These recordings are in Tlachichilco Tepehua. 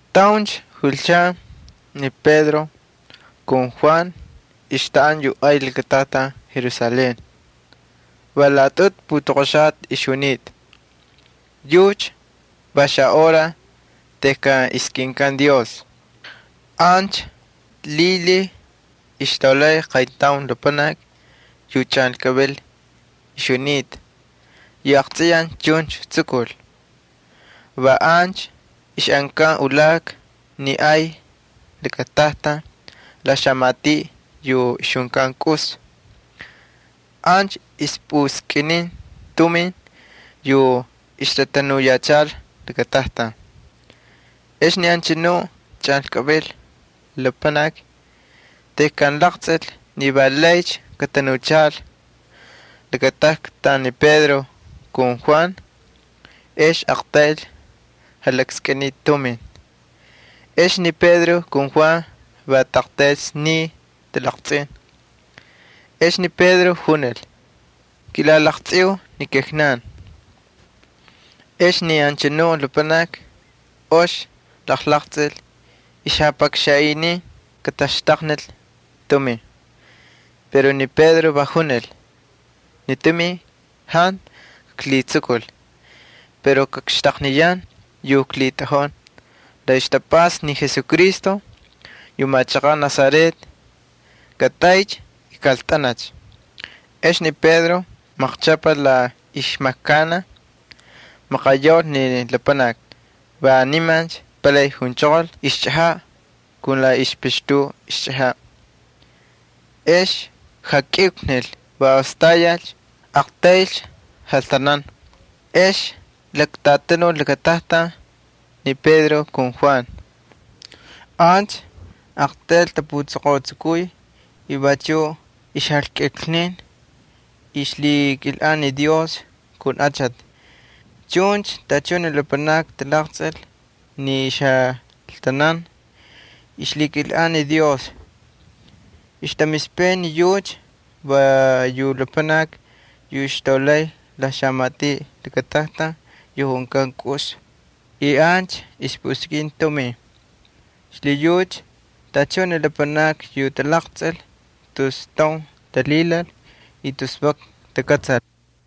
Tauncha julchan ni Pedro ali Juan ixtaꞌanta yu ay lakatajtan Jerusalén. Va laꞌatꞌutu putoqoxata ixjunita, yucha va xahora tejkan ixtaskꞌin Dios. Ancha lhilhiy ixtaulay qayntaun lapanaki yu chꞌanlkꞌavil ixjunita yu aqtsꞌiyaj chuncha tsukul. Va ancha ixꞌankan ulaka ni ay lakatajtan la xamatiꞌ yu ixjunkan Kꞌus. Ancha ixjapuskꞌiniy tumin yu ixtatanuyachal lakatajtan. Ex ni anchanu chꞌanlkꞌavil lapanaki tejkan jalaqtsꞌil ni va laycha katatanuchal lakatajtan ni Pedro ali Juan, ex aqtayl jalakskꞌiniy tumin. Ex ni Pedro ali Juan va aqtayl sniy talaqtsꞌin. Ex ni Pedro junil: —Kilalaqtsꞌiu ni kijnankꞌan. Ex ni anchanu lapanaki ox jalaqtsꞌil, ixjapakxanꞌiniy kataxtaqnil tumin. Pero ni Pedro va junil: —Ni tumin jantu kaklhitsukul. Pero kakxtaqniyan yu klhitꞌajun. La ixtapꞌasta ni Jesucristo yu machaqaꞌ Nazaret, katꞌaycha y kꞌaltꞌancha. Ex ni Pedro maqchꞌapal la ixmajkanaj, maqayaul ni lapanaki. Va niman palay junchoqol ixchꞌajaꞌ kun la ixpixtu ixchꞌajaꞌ. Ex jakꞌiuklnil, va ostayalcha, aqtaylcha jaltanan. Ex laktꞌatanul lakatajtan ni Pedro ali Juan. Ancha aqtayl tapuchoqotsukuy, y vachuꞌ ixjakꞌiuklnin, y ay ixmakay ni Dios kun achati. Chuncha tachun ni lapanakni talaqtsꞌil ni ixjaltanan y ixlhikilꞌan ni Dios. Ixtamispay ni yucha va yu lapanaki yu ixtaulay la xamatiꞌ lakatajtan yu junkan Kꞌus, y ancha ixpuskꞌin tumin. Xlhiyucha tachun ni lapanakni yu talaqtsꞌil tus taun talhilal y tus vak takꞌatsal.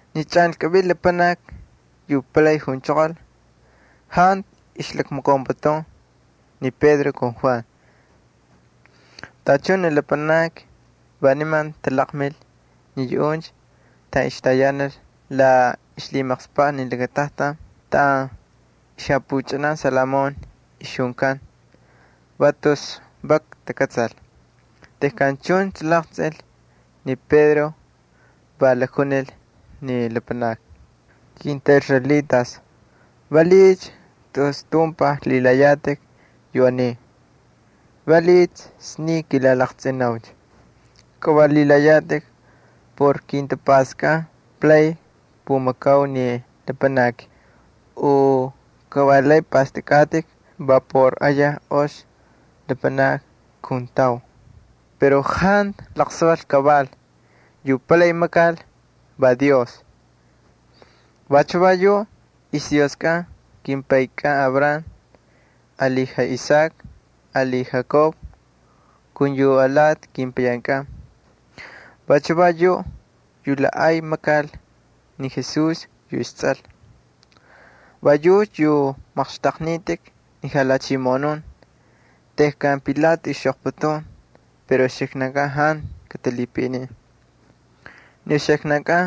Ni chꞌanlkꞌavil lapanaki yu palay junchoqol jantu ixjalakmakaunputun ni Pedro ali Juan. Tachun ni lapanakni va niman talaqmil ni yuꞌuncha taꞌan ixtayanal la ixlhimaqspaꞌ ni lakatajtan taꞌan xapuchꞌanan Salomón ixjunkan. Va tus vak takꞌatsal. Tejkan chuncha laqtsꞌil ni Pedro, va lakjunil ni lapanakni: —Kintꞌaꞌisraelitas, ¿valiꞌiycha tus tumpaj lhilayatꞌik yu aniy? ¿Valiꞌiycha sniy kilalaqtsꞌinaucha? Ka va lhilayatꞌik por kintapꞌastkꞌan palay kpumakau ni lapanaki u kavalay pꞌastꞌakꞌatꞌik va por ayaj ox lapanakni kuntau. Pero jantu laqsaval kaval. Yu palay makal va Dios. Vachu va yuꞌ ixDioskꞌan kimpaykꞌan Abraham ali Isaac ali Jacob ali yu alati kepayankꞌan. Vachu va yuꞌ yu la ay makal ni Jesús yu istsꞌal. Va yucha yu maqxtꞌaqnitꞌik ni lhachimoꞌonun tejkan Pilato ixxꞌoqputun pero uxiknankꞌan jantu katalhipaꞌinin. Ni uxiknankꞌan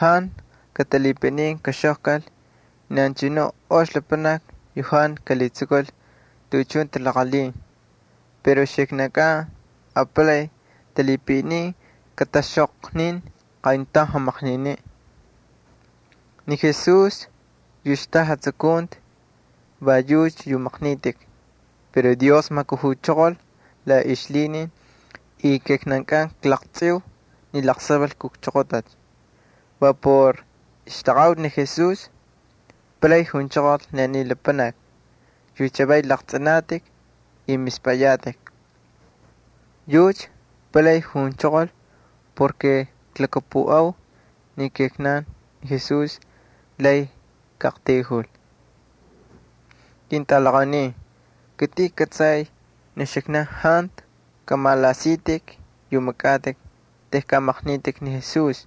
jantu katalhipaꞌinin kaxꞌoqkal ni anchanuꞌ ox lapanaki yu jantu kalhitsukul tuꞌuchun talaqalhin, pero uxiknan apalay talhipaꞌinin kataxꞌoqnin qayntaun jamaqniniꞌ. Ni Jesús yu xtaꞌa jatsukunti va yucha yu maqnitꞌik pero Dios majkujuchoqol la ixlhinin y kijnankꞌan klaqtsꞌiu ni laqsaval kujchoqotacha. Va por ixtaqaꞌuti ni Jesús palay junchoqol ni aniy lapanaki yu chavay laqtsꞌinatꞌik y mispꞌayatꞌik. Yucha palay junchoqol porke klhakapuꞌau ni Jesús lay kaꞌaqtayjul. Ketꞌalaqaunin, kitꞌin kꞌatsay ni uxiknan jantu kꞌamalaꞌasitꞌik yu makꞌatꞌik tejkan maqnitꞌik ni Jesús.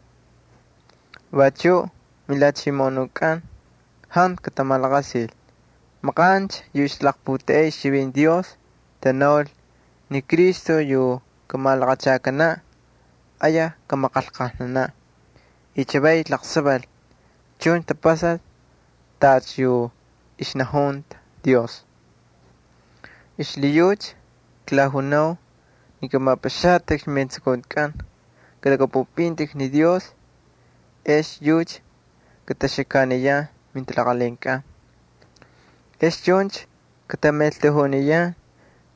Vachuꞌ milhachimoꞌonunkꞌan jantu katamalaqasil. Maqancha yu ixtalaqputeꞌey ixchivinti Dios tanaul ni Cristo yu kamalaqachakanaꞌ ayaj kamaqanlqajnanaꞌ. Y chavay laqsaval chuncha tapasal tacha yu ixnajunta Dios. Xlhiyucha klajunau ni kꞌamapꞌaxatꞌikcha mijatapastakꞌatkꞌan. Kꞌalhakꞌapꞌupꞌintꞌik ni Dios ex yucha kataxakaniyan mintalaqalhinkꞌan. Ex chuncha katamaꞌeltajuniyan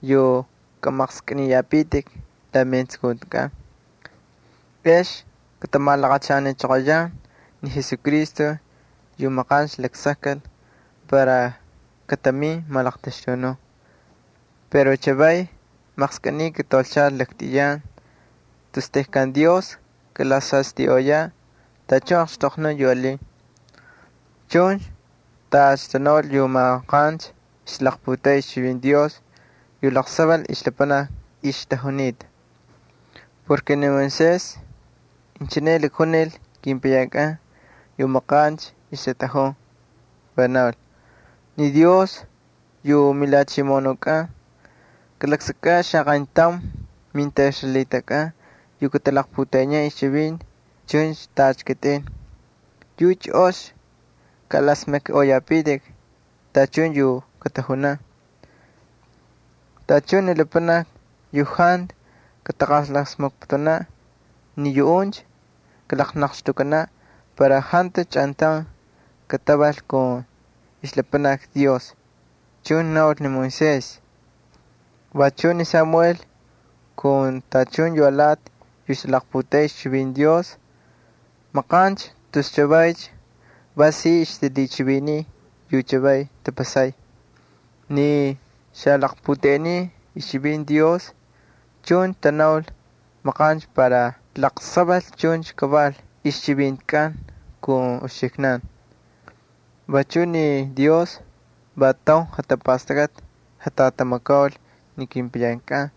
yu kꞌamaqskꞌiniyapitik la metsukuntikꞌan. Ex katamalaqachanichoqoyan ni Jesucristo yu maqancha laksakkal para katamin malaqtaxtunun. Pero chavaycha maqskꞌiniy kataulchal laktꞌiyan tus tejkan Dios kalasastꞌiꞌoyaꞌ tachun yu alin. Chuncha tacha tanaul yu maqancha ixtalaqputeꞌey ixchivinti Dios yu laqsaval ixlapanakni ixtajunita. Ni Moisés inchine lakjunil kepayankꞌan yu maqancha ixtatꞌajun, va naul: “Ni Dios yu miJalhachimoꞌonukꞌan kalaksakꞌaꞌ xaqayntaun mintꞌaꞌisraelitaskꞌan yu katalaqputeꞌeniyan ixchivinti chuncha tacha kitꞌin. Yucha ox kaꞌalasmakniꞌoyapitik tachun yu katajunan. Tachun ni lapanakni yu jantu kataqalasmakputunaꞌ ni yuꞌuncha kalaqnaqxtꞌukkanaꞌ para jantucha chꞌantaun katatꞌaval kun ixlapanakni Dios,” chuncha naul ni Moisés. Vachuꞌ ni Samuel ali tachun yu alati yu ixtalaqputeꞌey ixchivinti Dios maqancha tus chavaycha va si ixtalhichiviniy yu chavaycha tapasay. ’Ni xalaqputeꞌenin ixchivinti Dios chuncha tanaul maqancha para laqsaval chuncha kaval ixchivintikꞌan kun uxiknan. Vachuꞌ ni Dios va taun jatapastakꞌati jatꞌatamakaul ni kepayankꞌan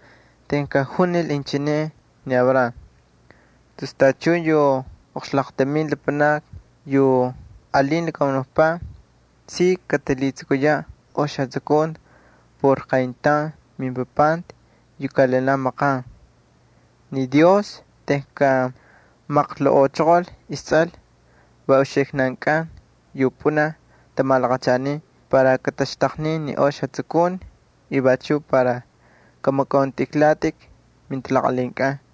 tejkan junil inchine ni Abraham: “Tus tachun yu oqxlaqtamin lapanakni yu alin lakamunukpaꞌ, si katalhitsukuyaꞌ ox jatsukunti por qayntaun mimpapanti yu kaꞌalinaꞌ maqan.” Ni Dios tejkan majkujuchoqol isTsꞌal va uxiknankꞌan yu pꞌunaj tamalaqachanin para kataxtaqnin yu ox jatsukunti y vachuꞌ para kꞌamakꞌauntꞌijlatꞌik mintalaqalhinkꞌan.